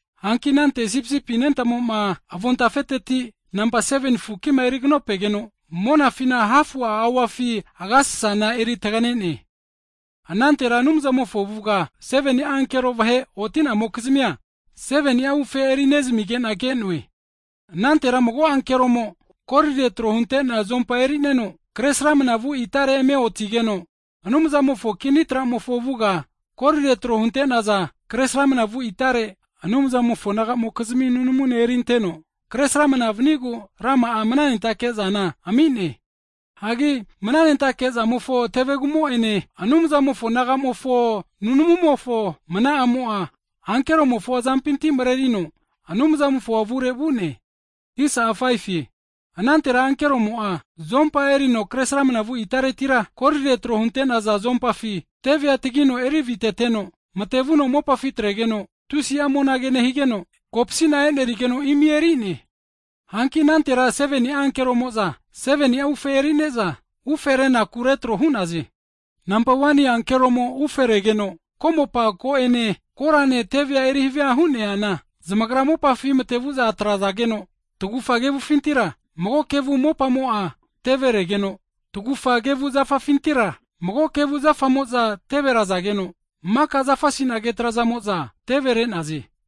Hanki anante Sipisipi anentamoma avontafeteti nampa 7ni fukima eri kanopegeno, monafina hafu'a auafi agasasana eritaganene. Anantera Anumzamofo avuga 7ni'a ankero vahe oti'namokizmia 7ni'a ufe eri nezamizage'na ke'noe. Anantera mago ankeromo kolire tro hunte'nea zuompa erineno kresramna vu itare eme otigeno, Anumzamofo kini tramofo avuga kolire tro hunte'naza kre sramnavu itare Anumzamofo nagamokizmi nunamune erinteno kresramna vanigu rama'a mananentake'zana ami'ne. Hagi mananentake zamofo tevegumo'ene, Anumzamofo nagamofo nunamumofo mna'amo'a, ankeromofo azampinti mrerino Anumzamofo avure vu'ne. Anantera ankeromo'a zuompa erino kre sramnavu itaretira, kolire tro hunte'naza zuompafi tevea tagino eri aviteteno, matevuno mopafi atregeno, tusi'a monage nehigeno, kopsina e'nerigeno, imi eri'ne. Hanki anantera 7ni'a ankeromo'za 7ni'a ufe erine'za, ufe renaku retro hu'naze. Ese ankeromo uferegeno, komopa ko'ene korane tevea eri havia hu'neana, zamagra mopafi matevu'za atrazageno, tagufa kevufintira, mago kevu mopamo'a teveregeno, tagufa kevu zafafintira, mago kevu zafamo'za teverazageno, maka zafa sinage trazamo'za tevere'naze.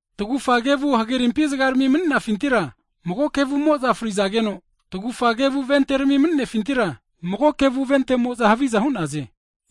tagufa kevu hagerimpi zagrami mni'nafintira, mago kevumo'za frizageno, tagufa kevu venterami me'nefintira, mago kevu ventemo'za haviza hu'naze.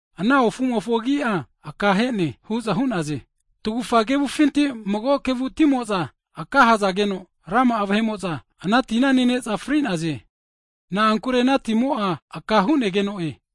Ana ofumofo agi'a Akahene, hu'za hu'naze. Tagufa kevufinti, mago kevu timo'za akahazageno, rama'a vahe'mo'za ana tina nene'za fri'naze. Na'ankure ana timo'a akahunegeno'e.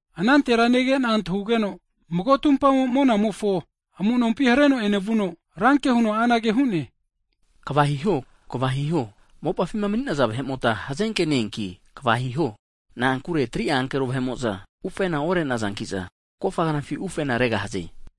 Anantera negena antahugeno, mago tumpamo monamofo amunompi hareno enevuno, ranke huno anage hune, kva hiho, kva hiho, mopafima maninaza vahemota hazenke ne-eanki kva hiho, na'ankure 3'a ankero vahe'mo'za ufena orenazankiza, kofa knafi ufena regahaze!